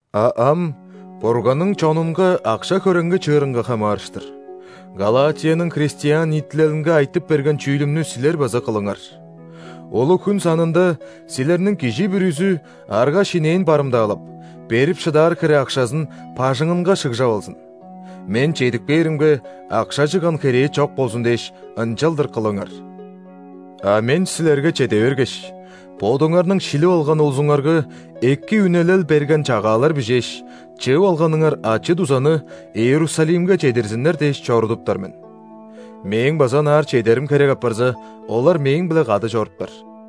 А ам Бурганның чонунга акша-хөреңги чыырынга хамаарыштыр: Галатияның христиан ниитилелинге айтып берген чүүлүмнү силер база кылыңар. Улуг-хүн санында силерниң кижи бүрүзү, арга-шинээн барымдаалап, берип шыдаар хире акшазын бажыңынга шыгжап алзын. Мен чедип кээримге, акша чыгган херээ чок болзун дээш, ынчалдыр кылыңар. А мен силерге чеде бергеш, бодуңарның шилип алган улузуңарга эки үнелел берген чагаалар бижээш, чыып алганыңар ачы-дузаны Иерусалимге чедирзиннер дээш чорудуптар мен. Мээң база ынаар чедерим херек апарза, олар мээң-биле кады чоруптар.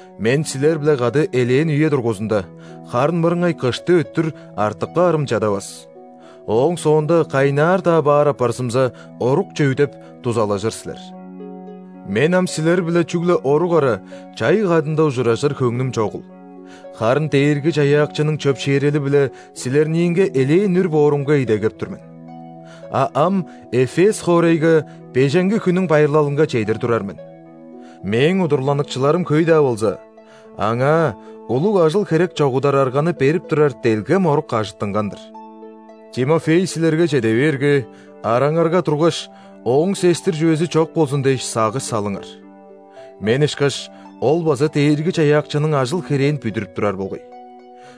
Мен силер-биле кады элээн үе дургузунда, харын мырыңай кышты өттүр, артып каарым чадавас. Ооң соонда кайнаар-даа баар апарзымза, орукче үдеп, дузалажыр силер. Мен ам силер-биле чүгле орук ара, чай кадында ужуражыр хөңнүм чогул, харын Дээрги-Чаяакчының чөпшээрели-биле силерниинге элээн үр боорумга идегеп тур мен. А ам Эфес хоорайга Беженги хүннүң байырлалынга чедир турар мен. Мээң удурланыкчыларым хөй-даа болза, аңаа улуг ажыл-херек чогудар арганы берип турар делгем орук ажыттынган-дыр. Тимофей силерге чеде бээрге, араңарга тургаш, ооң сестир чүвези чок болзун дээш, сагыш салыңар. Мен ышкаш, ол база Дээрги-Чаяакчының ажыл-херээн бүдүрүп турар болгай.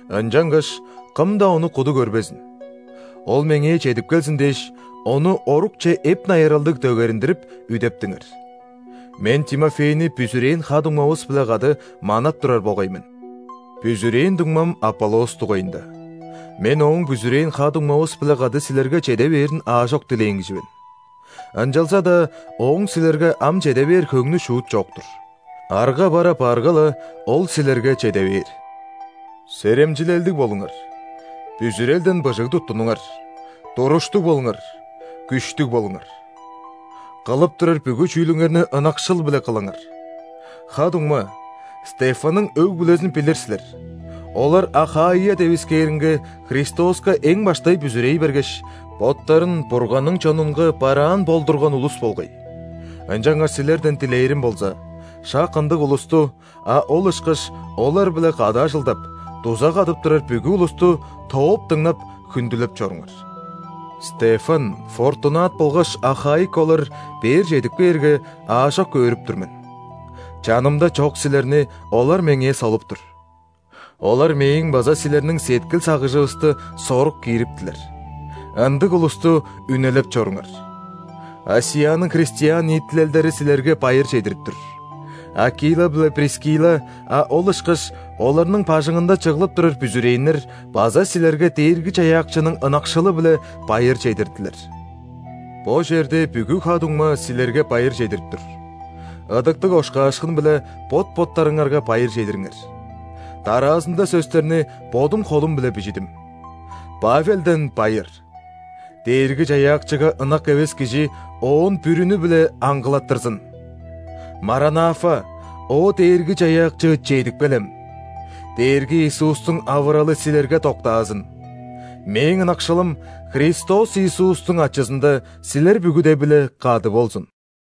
Ынчангаш кым-даа ону куду көрбезин. Ол меңээ чедип келзин дээш, ону орукче эп-найыралдыг дөгериндирип, үдептиңер. Мен Тимофейни бүзүрээн ха-дуңмавыс-биле кады манап турар болгай мен. Бүзүрээн дуңмам Аполлос дугайында: мен ооң бүзүрээн ха-дуңмавыс-биле кады силерге чеде бээрин аажок дилээн кижи мен. Ынчалза-даа ооң силерге ам чеде бээр хөңнү шуут чок-тур. Арга бар апаарга-ла, ол силерге чеде бээр. Серемчилелдиг болуңар, бүзүрелден быжыг туттунуңар, туруштуг болуңар, күштүг болуңар! Кылып турар бүгү чүүлүңерни ынакшыл-биле кылыңар! Ха-дуңма, Стефанның өг-бүлезин билир силер, олар Ахаия девискээринге Христоска эң баштай бүзүрей бергеш, боттарын Бурганның чонунга бараан болдурган улус болгай. Ынчангаш силерден дилээрим болза: шак ындыг улусту, а ол ышкаш олар-биле кады ажылдап, дуза кадып турар бүгү улусту тооп дыңнап, хүндүлеп чоруңар. Стефан, Фортунат болгаш Ахаик олар бээр чедип кээрге, аажок өөрүп тур мен. Чанымда чок силерни олар меңээ солуп тур. Олар мээң база силерниң сеткил-сагыжывысты сорук киириптилер. Ындыг улусту үнелеп чоруңар! ·Асияның христиан ниитилелдери силерге байыр чедирип тур. Акила биле Прискилла, а ол ышкаш оларның бажыңында чыглып турар бүзүрээннер база силерге Дээрги-Чаяакчының ынакшылы-биле байыр чедирдилер. Бо черде бүгү ха-дуңма силерге байыр чедирип тур. Ыдыктыг ошкаашкын-биле бот-боттарыңарга байыр чедириңер. Дараазында сөстерни бодум холум-биле бижидим: Павелден байыр. Дээрги-Чаяакчыга ынак эвес кижи Оон бүрүнү-биле аңгылаттырзын! Маранафа – О Дээрги-Чаяакчы, чедип келем! Дээрги Иисустуң авыралы силерге доктаазын! Мээң ынакшылым Христос Иисустуң ачызында силер бүгүде-биле кады болзун!